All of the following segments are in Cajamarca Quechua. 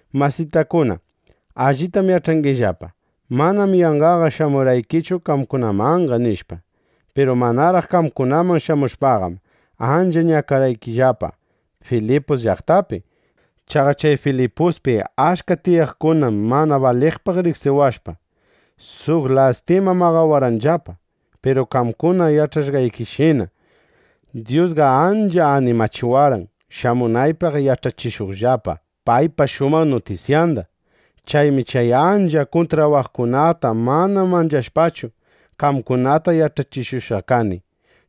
Masitakuna, allitam yach'angillapa: Manam yanqaqa shamurqanichu qamkunamanqa, nishpa. Piru manaraq qamkunaman shamushpaqam, ancha ñakarqayllapa Filipus llaqtapi. Chaqa chay Filipuspi achka tiyaqkunam mana baliqpaq riqsiwashpa, suq lastima maqawarqanllapa. Piru qamkuna yach'ashqaykishina, Dyusqa ancha animachiwarqan, shamunaypaq yach'achishuqllapa paypa shumaq nutisyanda. Chaymi chay ancha kuntrawaqkunata mana manchashpachu, qamkunata yach'achishushqa kani.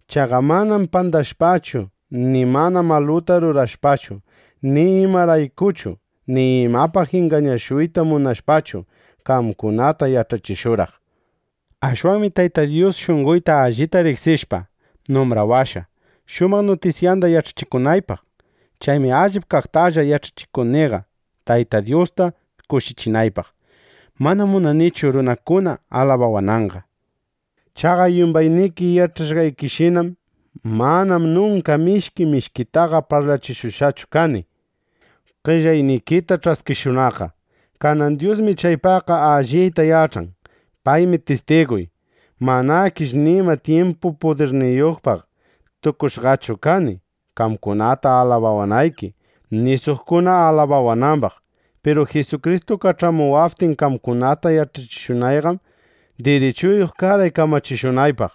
Chaqa manam pandashpachu, ni ima maluta rurashpachu, ni imaraykuchu, ni imapaq ingañashuyta munashpachu, qamkunata yach'achishurqaq. Ashwanmi Tayta Dyus shunqoyta allita riqsishpa, numbrawashqa, shumaq nutisyanda yach'achikunaypaq. Chaymi allip kaqtalla yach'achikuniqa, Tayta Dyusta kushichinaypaq. Manam munanichu, runakuna alabawananqa. Chaqa yumbayniki yach'ashqaykishinam, manam nunka mishki mishkitaqa parlachishushqachu kani, qellaynikita ch'askishunaqqa. Kanan Dyusmi chaypaqqa allita yach'an. Paymi tistiguy. Manakish nima tyimpu pudirniyuqpaq tukushqachu kani, qamkuna alabawanayki, ni suqkuna alabawanambaq. Piru Jisukristu kach'amuwaptin qamkunata yach'achishunayqam, dirichuyuq karqay kamachishunaqpaq.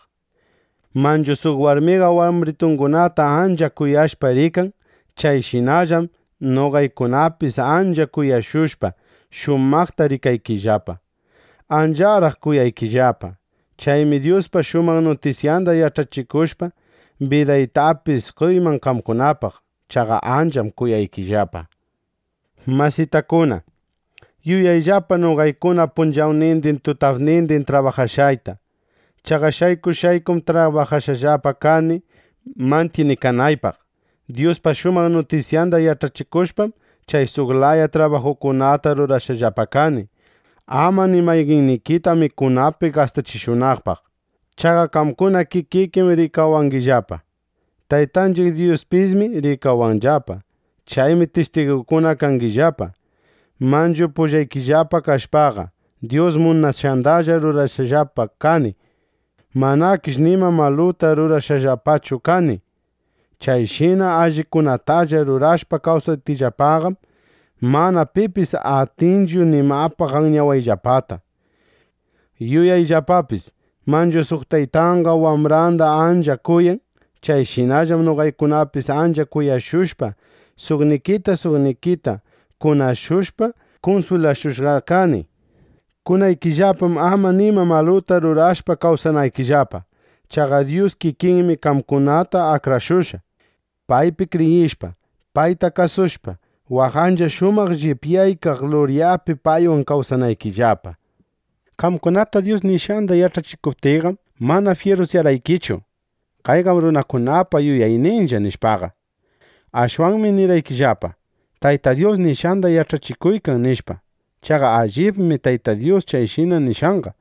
Manchu suq warmiqa wambritungunata ancha kuyashpa rikan. Chayshinallam noqaykunapis ancha kuyashushpa, shumaqta rikaykillapa. ¡Ancharaq kuyaykillapa! Chaymi Dyuspa shumaq nutisyanda yach'achishushpa, bidaytapis qoyman qamkunapaq. Chaqa ancham kuyaykillapa. Masitakuna, yuyayllapa noqaykuna punchawnindin tutapnindin trabajashqayta. Chaqa shayku shaykum trabajashqallapa kani mantyinikanaypaq. Dyuspa shumaq nutisyanda yach'achishushpam, chay suq laya trabajukunata rurashqallapa kani, ama ni mayqannikita mikunapi gastachishunaqpaq. Chaqa qamkuna kikikim rikawangillapa. Taytanchiq Dyuspismi rikawanllapa. Chaymi tistiguykuna kangillapa. Manchu pullaykillapa kashpaqa, Dyus munashqandalla rurashqallapa kani. Manakish nima maluta rurashqallapachu kani. Chayshina allikunatalla rurashpa kawsaptiyllapaqam, mana pipis atinchu nimapaq anyawayllapata. Yuyayllapapis, manchu suq taytaqa wambranda ancha kuyan. Chayshinallam noqaykunapis ancha kuyashushpa, suqnikita suqnikita kunashushpa, kunswilashushqa kani. Kunaykillapam ama nima maluta rurashpa kawsanaykillapa. Chaqa Dyus kikinmi qamkunata akrashushqa, paypi kriyishpa, payta kasushpa, waq ancha shumaq llipyaykaq luryapi paywan kawsanaykillapa. Qamkunata Dyus nishqanda yach'achishuptiyqam, mana fyirusyawarqaykichu: “Kayqam runakunapa yuyayninlla”, nishpaqa. Ashwanmi nirqaykillapa: “Tayta Dyus nishqanda yach'achikuykan”, nishpa. Chaqa allibmi Tayta Dyus chayshina nishqanqa.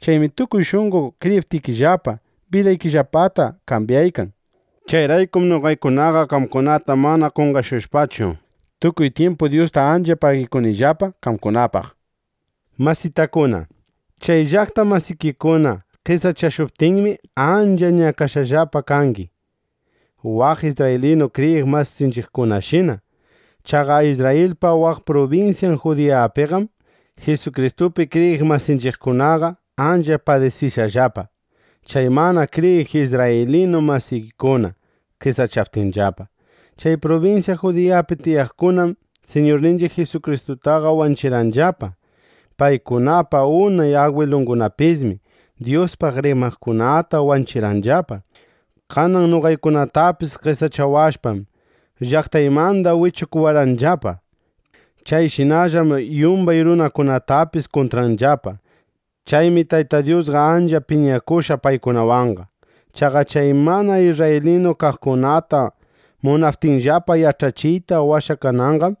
Chaymi tukuy shunqo kriyiptikillapa, bidaykillapata kambyaykan. Chayraykum noqaykunaqa qamkunata mana qonqashushpachu, tukuy tyimpu Dyusta ancha pagikunillapa qamkunapaq. Masitakuna, chay llaqta masikikuna qesachashuptinmi, ancha ñakashqallapa kangi, waq isrraylinu kriyiq masinchiqkunashina. Chaqa Isrrayilpa waq prubinsyan Judiyapiqam Jisukristupi kriyiq masinchiqkunaqa ancha padisishqallapa, chay mana kriyiq isrraylinu masiykuna qesachaptinllapa. Chay prubinsya Judiyapi tiyaqkunam Siñurninchiq Jisustaqa wanchirqanllapa. Paykunapa unay agwilungunapismi Dyuspaq rimaqkunata wanchirqanllapa. Kanan noqaykunatapis qesachawashpam, llaqtaymanda wichukuwarqanllapa. Chayshinallam yumbay runakunatapis kuntranllapa. Chaymi Tayta Dyusqa ancha piñakushqa paykunawanqa. Chaqa chay mana isrraylinu kaqkunata munaptiyllapa yach'achiyta washakananqam,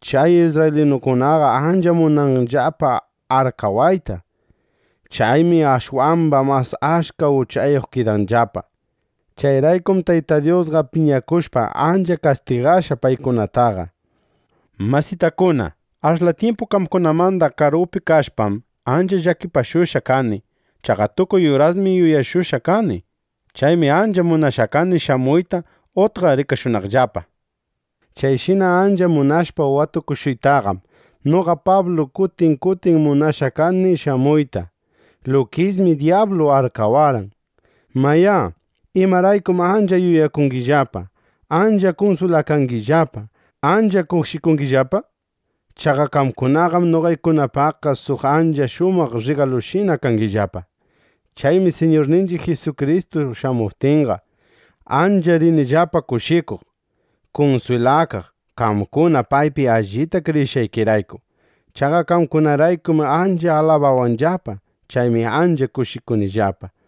chay isrraylinukunaqa ancha munanllapa arkawayta. Chaymi ashwamba mas achka uchayuq kidanllapa. Chayraykum Tayta Dyusqa piñakushpa, ancha kastigashqa paykunataqa. Masitakuna, ashla tyimpu qamkunamanda karupi kashpam, ancha llakipashushqa kani. Chaqa tukuy urasmi yuyashushqa kani. Chaymi ancha munashqa kani shamuyta utqa rikashunaqllapa. Chayshina ancha munashpa watukushuytaqam, noqa Pablu kutin kutin munashqa kani shamuyta. Lukismi dyablu arkawarqan. Mayá, ¿imaraykum ancha yuyakunillapa, ancha kunswilakanillapa, ancha kushikunillapa? Chaqa qamkunaqam noqaykunapaqqa suq ancha shumaq rrigalushina kangillapa. Chaymi Siñurninchiq Jisukristu shamuptinqa, ancha rinillapa kushikuq, kunswilakaq, qamkuna paypi allita kriyishqaykirayku. Chaqa qamkunaraykum ancha alabawanllapa. Chaymi ancha kushikunillapa.